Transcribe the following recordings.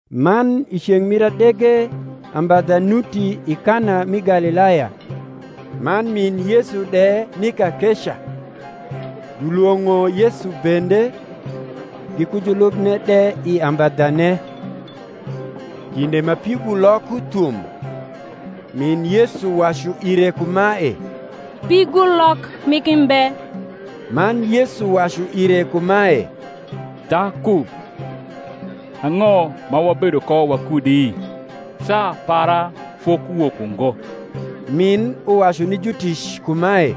Man i ceng’ mir adege ambadha nuti i Kana mi Galilaya; man min Yesu de ni kakeca: julwong’o Yesu bende, giku julubne de i ambadhane. Kinde ma pigulok uthum, min Yesu wacu ire kumae, Pigulok migi mbe. Man Yesu wacu ire kumae, Dhaku, ang’o ma wabedo ko wakudi? saa para fokuwok ungo. Min uwacu ni jutic kumae,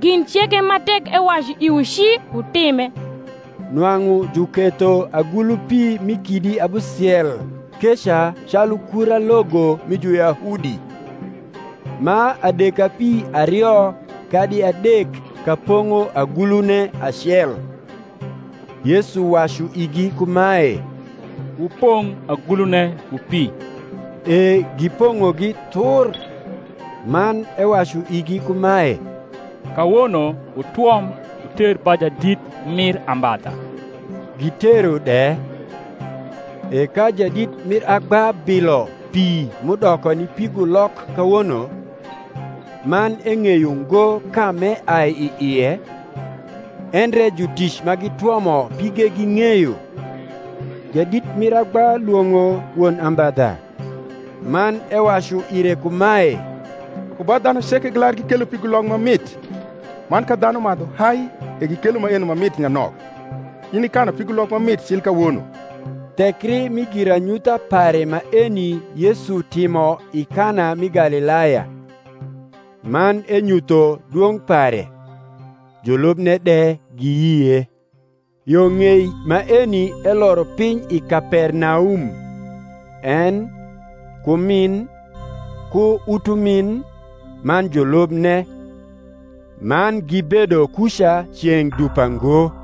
Gin ceke ma tek ewacu iwu ci, wutime. Nwang’u juketho agulu pi mi kidi abusiel keca calu kura logo mi Juyahudi, ma adekapi ario kadi adek ka pong’o agniune acel. Yesu wacu igi kumae, Wupong’ agulune ku pi. E gipong’ogi thur. Man ewacu igi kumae, Kawono wutwom, wuter ba jadit mir ambadha. Gitero de. E ka jadit mir agba bilo pi m’udoko ni pigulok kawono, man eng’eyo ngo ka m’eai i ie (endre jutic ma gitwomo pige ging’eyo), jadit mir agba lwong’o won ambadha, man ewacu ire kumae, Ku ba dhanu ceke gilar gikelo pigulok ma mit; man ka dhanu madhu hai, e gikelo maeno ma mit nyanok: in ikanu pigulok ma mit cil kawono. Thekri mi giranyutha pare maeni Yesu timo i Kana mi Galilaya, man enyutho dwong’ pare; julubne de giyie. Yo ng’ei maeni eloro piny i Kapernaum, en, ku min, ku utumin, man julubne; man gibedo kuca ceng’ dupa ngo.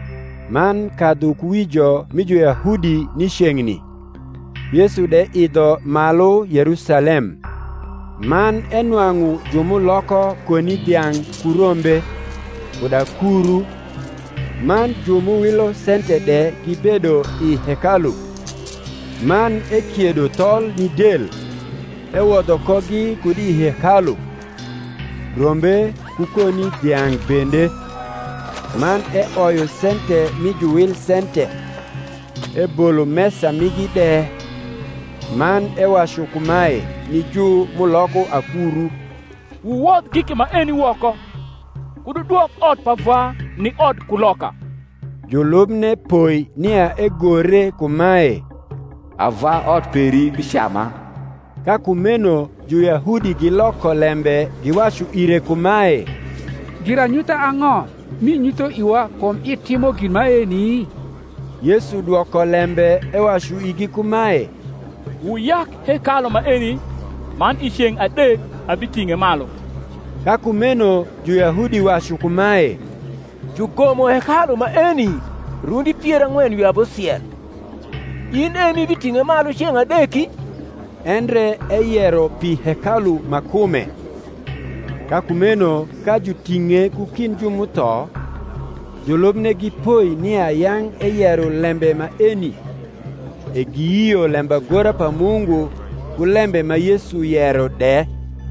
Man kadhukuwijo mi Juyahudi ni ceng’ni, Yesu de idho malu Yerusalem. Man enwang’u ju m’uloko koni dhiang’ ku rombe, kud akuru, man ju m’uwilo sente de gibedo i hekalu: man ekiedo thol ni del, ewodho kogi kud i hekalu, rombe ku koni dhiang’ bende; man eoyo sente mi juwil sente, ebolo mesa migi de; man ewacu kumae ni ju m’uloko akuru, Wuwodh giki maeni woko; kud wudwok ot pa Vwa ni odkuloka. Julubne poi nia egore kumae, Ava ot peri bicama. Ka kumeno Juyahudi giloko lembe giwacu ire kumae, Giranyutha ang’o m’inyutho iwa kum itimo gin maeni? Yesu dwoko lembe ewacu igi kumae, Wuyak hekalu maeni, man i ceng’ adek abiting’e malu. Ka kumeno Juyahudi wacu kumae, Jugomo hekalu maeni rundi pier ang’wen wi abusiel, in e m’ibiting’e malu ceng’ adeki? endre eyero pi hekalu ma kume. Ka kumeno ka juting’e ku kind ju m’utho, julubne gipoi nia yang’ eyero lembe maeni; e giyio lembagora pa Mungu, ku lembe ma Yesu yero de.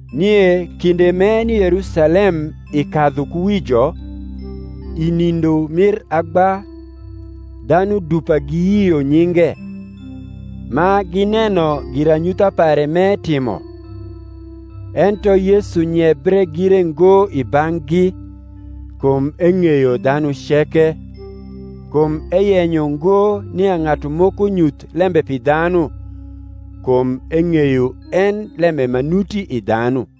Nie kinde m’eni i Yerusalem i kadhukuwijo, i nindo mir agba, dhanu dupa giyio nyinge, ma gineno giranyutha pare m’etimo. Ento Yesu nyebre gire ngo i bang’gi, kum eng’eyo dhanu ceke, kum eyenyo ngo nia ng’atu moko nyuth lembe pi dhanu; kum eng’eyo en lembe ma nuti i dhanu.